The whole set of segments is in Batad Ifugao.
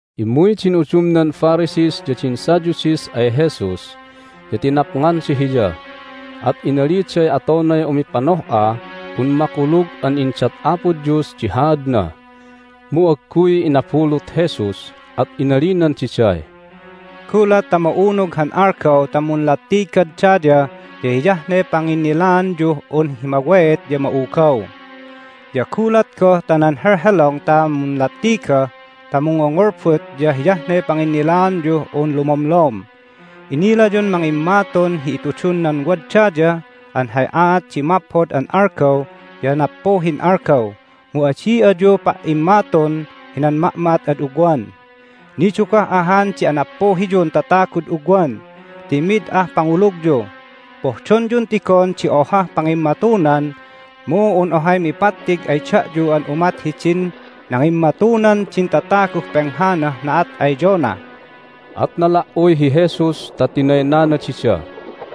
Immuy din udumnan Pharisees ya din Sadducees ay Jesus, ya tinapnganda Hiya, at inaliday atonay umipanoh'ah un makulug an indat Apo Dios di haadna. Mu agguy inabulut Jesus, at inalinan diday, "Gulat ta ma'unug han algaw ta munlattigad daya ya hiyah ne panginnilaanyuh un hi maweet ya ma'ugaw. Ya gulat goh ta nan helhelong ta munlattiga ta mungngongolbot ya hiyah ne panginnilaanyuh un lumomlom. Inilayun mangimmatun hi itudun nan wad daya an hay aat di maphod an algaw ya nappuhin algaw, mu adi ayu pa"immatun hinan ma'ma'at ad ugwan! Nidugah ahan di anappuhiyun tatagud ugwan ti mid ah pangulugyu! Pohdonyun tigon di ohah pangimmatunan, mu un ohay mipattig ay da'yu an umat hidin nangimmatunan din tataguh penghanah na'at ay Jonah." At nala"uy hi Jesus ta tinaynana dida.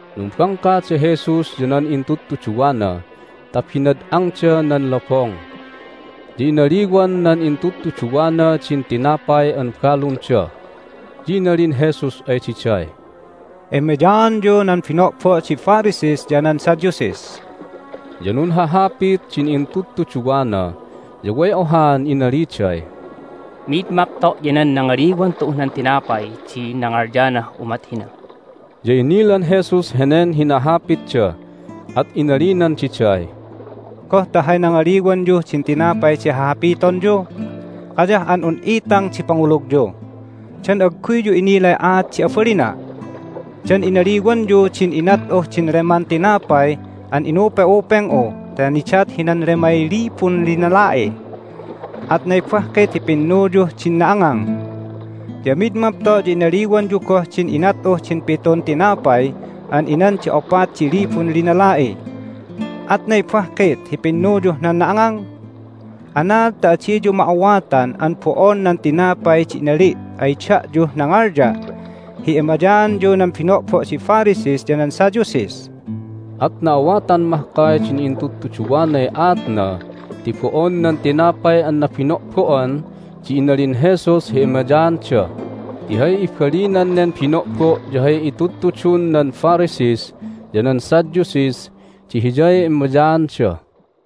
Numbangka da Jesus ya nan intudtuduwana ta binad'angda nan lobong. Ya inaliwan nan intudtuduwana din tinapay an balunda. Ya inalin Jesus ay diday, "Emayaanyu nan bino'bo' di Pharisees ya nan Sadducees." Ya nunhahapit din intudtuduwana, ya way ohaan inaliday, "Mid mapto' ya nan nangaliwan tu'uh nan tinapay di nangalyah umat hina." Ya inilan Jesus henen hinahapitda, at inalinan diday, "Goh ta hay nangaliwanyuh din tinapay di hahapitonyu? Kayah an un itang di pangulugyu! Dan agguyyu inilay aat di abalina'? Dan inaliwanyu din inat'uh din leman tinapay an inupe'upeng'u ta nidat hinan lemay libun linala'i? Atnay bahkit hi pinnuyuh din na'angang? Ya mid mapto' ya inaliwanyu goh din inat'uh din pitun tinapay an inan din opat di libun linala'i. Atnay bahkit hi pinnuyuh nan na'angang? Anaad ta adiyu ma'awatan an bo'on nan tinapay di inali' ay da'yuh nangalya' hi emayaanyu nan bino'bo' di Pharisees ya nan Sadducees?" At na'awatan mahkay din intudtuduwanay aatna ti bo'on nan tinapay an nabino'bo'an di inalin Jesus hi emayaanda, ti hay ibalinan nen bino'bo' ya hay itudtudun nan Pharisees ya nan Sadducees di hiyay emayaanda.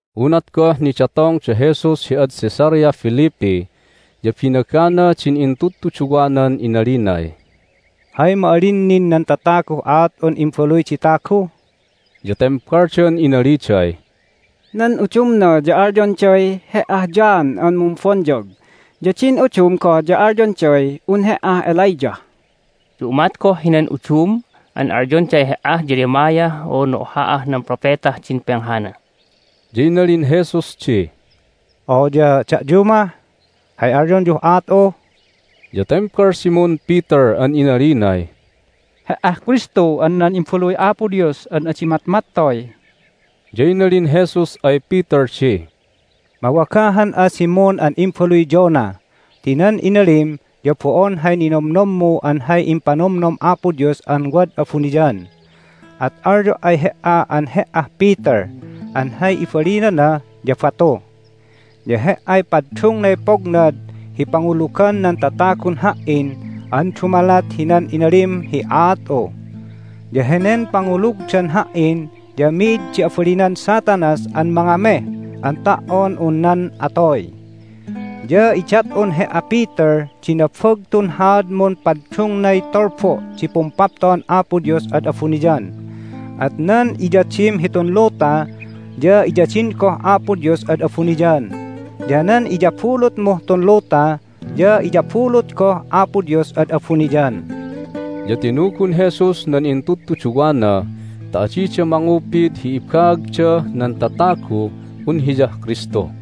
Unat goh nidatong da Jesus hi ad Caesarea Philippi ya binagana din intudtuduwanan inalinay, "Hay ma'alin nin nan tataguh aat'un Imbaluy di Tagu?" Ya tembaldan inaliday, "Nan udumna ya alyonday He"ah John an Mumbonyag, ya din udum goh ya alyonday un He"ah Elijah, ya umat goh hinan udum an alyonday He"ah Jeremiah unu oha'ah nan propetah din penghana." Ya inalin Jesus di, "Oya da'yu mah, hay alyonyuh aat'u?" Ya tembal Simon Peter an inalinay, "He"ah Kristu an nan Imbaluy Apo Dios an adi matmattoy!" Ya inalin Jesus ay Peter di, "Mawagahan'a, Simon an imbaluy Jonah, ti nan inalim ya bo'on hay ninomnommu an hay impanomnom Apo Dios an wad abuniyan! At alyo' ay he"a an he"ah Peter (an hay ibalinana ya batu). Ya he"ay paddungnay pognad hi pangulugan nan tatagun Ha"in an dumalat hinan inalim hi aat'u. Ya henen pangulugdan Ha"in ya mi'id di abalinan Satanas an mangameh an ta"on un nan atoy. Ya idat'un he"a, Peter, di nabagtun haadmun paddungnay tulbu' di Pumpapto'an Apo Dios ad abuniyan, at nan iyadim hitun luta ya iyadin goh Apo Dios ad abuniyan, ya nan iyabulutmuh tun luta ya iyabulut goh Apo Dios ad abuniyan." Ya tinugun Jesus nan intudtuduwana ta adida mangupid hi ibaagdah nan tataguh un Hiyah Kristu.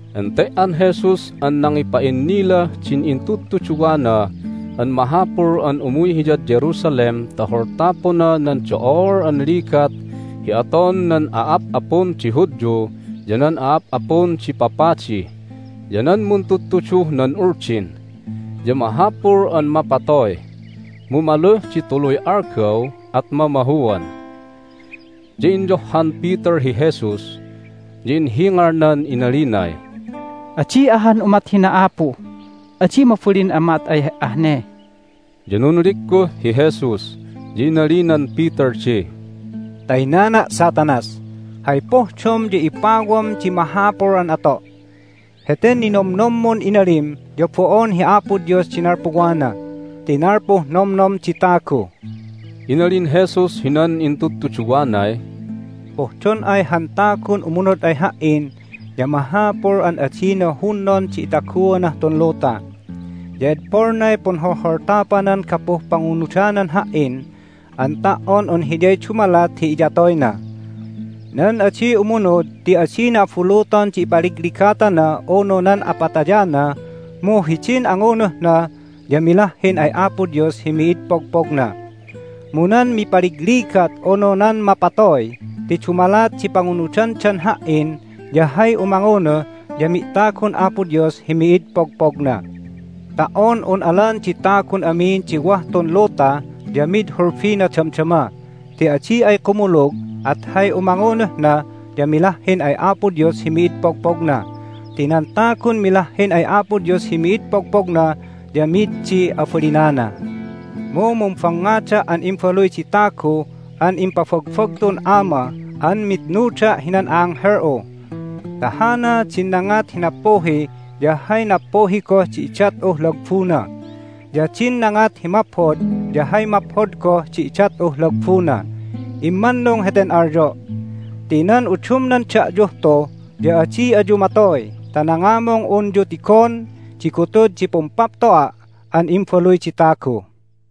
Ente"an Jesus an nangipa'innilah din intudtuduwana an mahapul an umuy Hiyad Jerusalem ta holtapona nan do'ol an ligat hi aton nan a'ap'apun di Hudyu ya nan a'ap'apun di papadi, ya nan muntudtuduh nan Uldin. Ya mahapul an mapatoy, mu maluh di tuluy algaw at mamahuan. Ya inyohhan Peter hi Jesus, ya inhingalnan inalinay, "Adi ahan umat hina, Apu! Adi mabalin an ma'at ay He"ah ne!" Ya nunligguh hi Jesus, ya inalinan Peter di, "Taynana', Satanas! Hay pohdom ya ipawam di mahapul an ato'! Heten ninomnommun inalim ya bo'on hi Apo Dios di nalpuwana ti nalpuh nomnom di tagu!" Inalin Jesus hinan intudtuduwanay, "Pohdon ay han tagun umunud ay Ha"in ya mahapul an adina hunnon di itaguanah tun luta, ya edpolnay punholholtapanan gapuh pangunudanan Ha"in an ta"on un hiyay dumalat hi iyatoyna. Nan adi umunud ti adina abuluton di ipaligligatana unu nan apatayana, mu hidin angunuhna ya milahhin ay Apo Dios hi mid pogpogna. Mu nan mipaligligat unu nan mapatoy ti dumalat di pangunudandan Ha"in ya hay umangunuh ya mi'tagun Apo Dios hi mid pogpogna. Ta"on un alan di tagun amin di wah tun luta ya mid hulbina damdama ti adi ay kumulug at hay umangunuhna ya milahhin ay Apo Dios hi mid pogpogna. Ti nan tagun milahhin ay Apo Dios hi mid pogpogna ya mid di abalinana. Mu mumbangngada' an Imbaluy di Tagu an impabagbagtun Ama an mitnuda' hinan a'anghel'u. Ta hana din nangat hi nappuhi ya hay nappuhi goh di idat'uh lagbuna, ya din nangat hi maphod ya hay maphod goh di idat'uh lagbuna. Immannung heten alyo' ti nan udumnan da'yuh tu ya adi ayu matoy ta nangamung unyu tigon di gutud hi Pumpapto'a' an Imbaluy di Tagu."